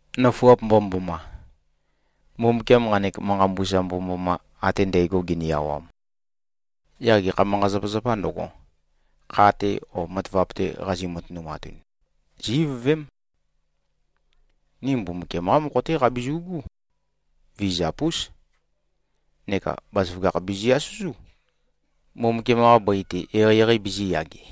Nøfuap mbomømboma! Mbumbukiam nqanek manqa mbusa mbomømboma ate ndægo gini-awam, yaq gekha manqa-zapazapā ndøgo, kha-te o matavap-te qazi-matønumatun, zí-ivøvém. Ni Mbumbukiam-qá mokho-té qabizu꞉gú. Vizap-ús. Neka bazaføgakh bizi-asøzú, Mbumbukiam-qa bøi-te eqeieqei bizīyage.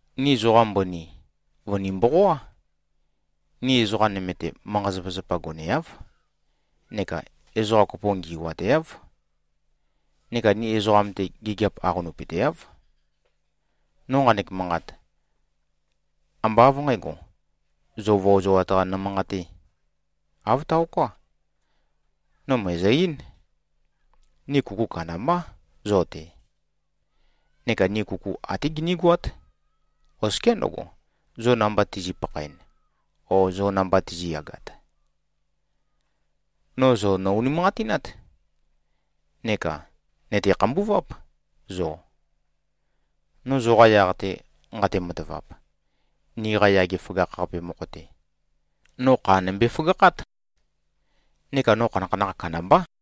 Ni zoqa mbøni, vø̀ni-mboqoá. Ni ezoqam-te manqa-zapazapa goneáv, neka ezoqa kopo ngi꞉wateáv. Neka ni ezoqam-te, gigiap aqonøpøteáv. No nqanek manqat, ambá av nqǣgo, zo vøozoat-qa nømanqatē. Āv taoká. No mø̀ezø-eín. Ni kuku kandambá zo-te, neka ni kuku até ginígoát, oskiá ndøgo, zo namba tizi꞉-pakhaen o zo namba tizi꞉yagat. No zo nò-unimanqatinát. Neka nø̀te-khambuváp, zo. No zoqa yaq-te nqate-matavap, niqa yage føgakh-qape mokho-te, no kha nømbe-føgakhát. Neka no khanakhanakh kandambá.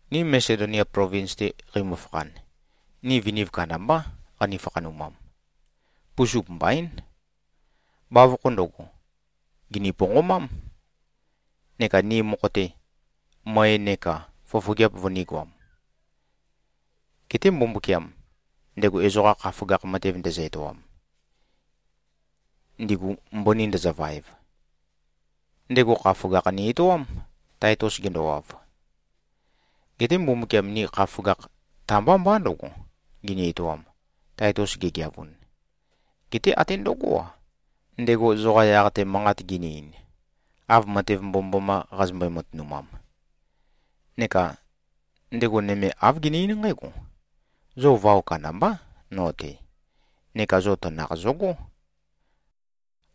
Ni Masedonia plovins-te qeimø-fakhan, ni viniv kandambá, qani-fakhanumam. Pusup mbaín. Bavokho ndøgo, gìni-ponqomám, neka ni mokho-te, møe neka fofogeap vønīgoam. Geté Mbumbukiam, ndego ezoqa kha føgakh matev ndezø-etoam, ndigu mbøni ndøzøvaev, ndego kha føgakh ni-etoám, Taitus gendowav. Geté Mbumbukiam ni kha føgakh ta-mbá mbá ndøgo, gini-etoam, Taitus gegeavun, geté até ndøgó-a, ndego zoqa yaq-te manqat gini-ein, av matev mbomømboma qazømbøe-matønumam. Neka ndego nøme āv gene-eín nqǽgo: Zo vao kandambá no-te, neka zo tanakh zøgó,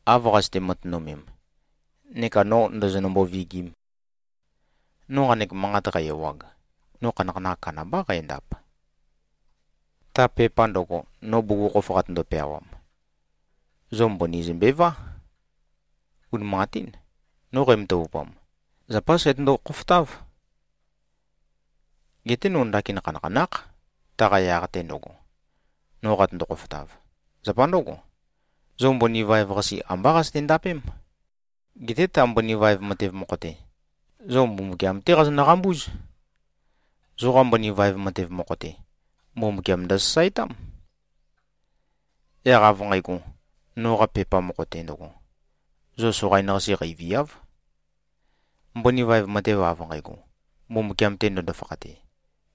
av qazøte-matønømem, neka no ndø̄zø̄nø̄mbō-vīgīm. No nqanek manqat qæ-ewag, no khanakhanakh kandambá qændap. Ta pepa ndøgo, no bugukhokhof qatøndo-peawam, zo mbøni zømbevá. Unimanqatín, no qæmatavupam, zapá sætøndo-khofotáv. Geté no ndakin khanakhanákh, taqa yaq-te ndøgo, no qatøndo-khofotav. Zapa ndǿgo, zo mbøni vaev-qase ambá qazøte-ndapém. Geté ta mbøni vaev matev mokho-te, zo Mbumbukiam-té qazonø-qambúz. Zoqa mbøni vaev matev mokho-te, Mbumbukiam ndøsasaetám. Yaq av nqægo, noqa pepa mokho-te ndøgo, zo soqain-qase qeiviáv. Mbøni vaev matev av nqægo, Mbumbukiam-te ndøndo-fakhate,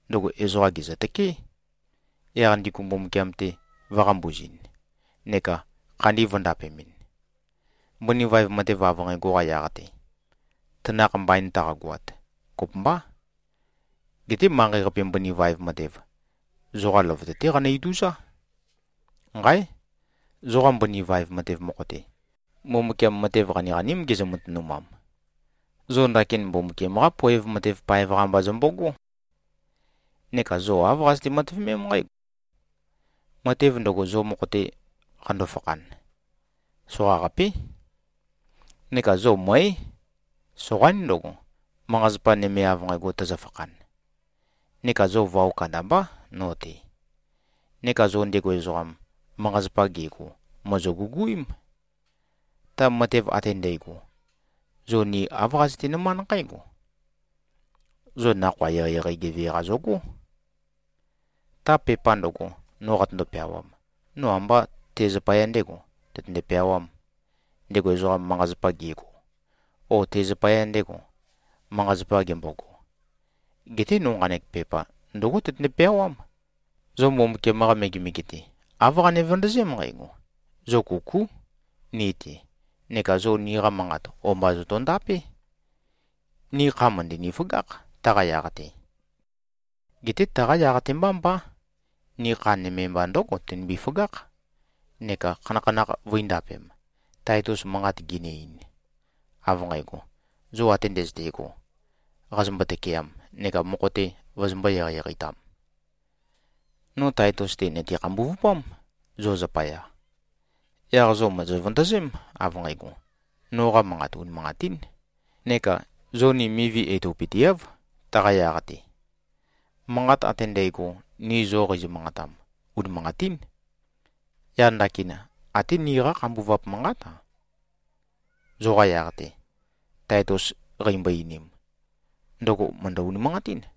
ndøgo ezoqa gèzøtøkeé, yaq ndigu Mbumbukiam-te vø̄-qambuzɨn, neka khandi vø̄ndapemɨn. Mbøni vaev matev av nqægo-qa yaq-te, tanakh mbain taqagoat, kopømbá. Geté manqei-qape mbøni vaev matev, ezoqa løvøte-té qanø-ituzá. Nqáe! Zoqa mbøni vaev matev mokho-te, Mbumbukiam matev qaniqaním gezø-matønumam. Zo ndakin Mbumbukiam-qá poev matev paev-qa mba zombogó. Neka zo āv qazøte-matøvemém nqǽgo: Matev ndøgo, zo mokho-te qando-fakhan, soqaqapé. Neka zo mǿe. Soqaín ndøgo, manqa-zapa nøme av nqægo tøzøfakhan. Neka zo vao kandambá no-te. Neka zo ndego ezoqam, manqa-zapa gego, mòzo-guguím. Ta matev ate ndægo, zo ni āv qazøte-nømánd nqǽgo: Zo nakhoa eqeieqei geve-qa zogó. Ta pepa ndøgo, no qatøndo-peawam, no ambá te zapaya ndēgo, tøtønde-peawām, ndego ezoqam, manqa-zapa gego o te zapaya ndego, manqa-zapa gembogo. Geté no nqanek pepa ndǿgo tøtønde-peawám: Zo Mbumbukiam-qa megemege-te, āv qane-vøndøzém nqægo: Zo kukú ni-te neka zo niqa manqat o-mba zotondapé. Ni kha mø̀ndøni-føgákh, taqa yaq-te. Geté taqa yaq-te mbá mbá. Ni kha nøme mba ndǿgo tønimbi-føgákh neka khanakhanakh vø̄indapem, Taitus manqat gini-ein, av nqægo, zo ate ndøzøte꞉go, qazombo-tøkeam neka mokho-te vozombō-eqeieqei-tam. No Taitus-te, nø̀te-khambuvupám, zo zapaya. Yaq zo mòzo-vøndøzém, av nqægo, noqa manqat unimanqatín, neka zo ni mivi etopøteáv, taqa yaq-te. Manqat ate ndægo, ni zo qeizø-manqatam, unimanqatín. Yaq ndakin, até niqá khambuvap manqát-a, zoqa yaq-te Taitus qeimbo-einim, ndøgo mø̀ndø-unimanqatín.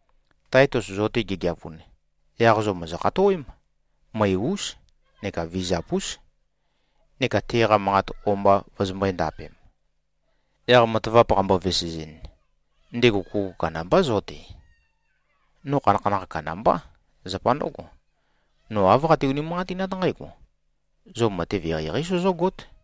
Taitus zo-te gegeavun, yaq zo mòzo-khatowém, møe-ús neka vizap-ús, neka teqa manqat o-mba vøzømbø̄e-ndapem. Yaq matavap qambo-vesezɨn, ndego kuku kandambá zo-te. No khanakhanakh kandambá. Zapa ndǿgo, no āv qate-unimanqatinát nqǽgo: Zo matev eqeieqeí sozógót.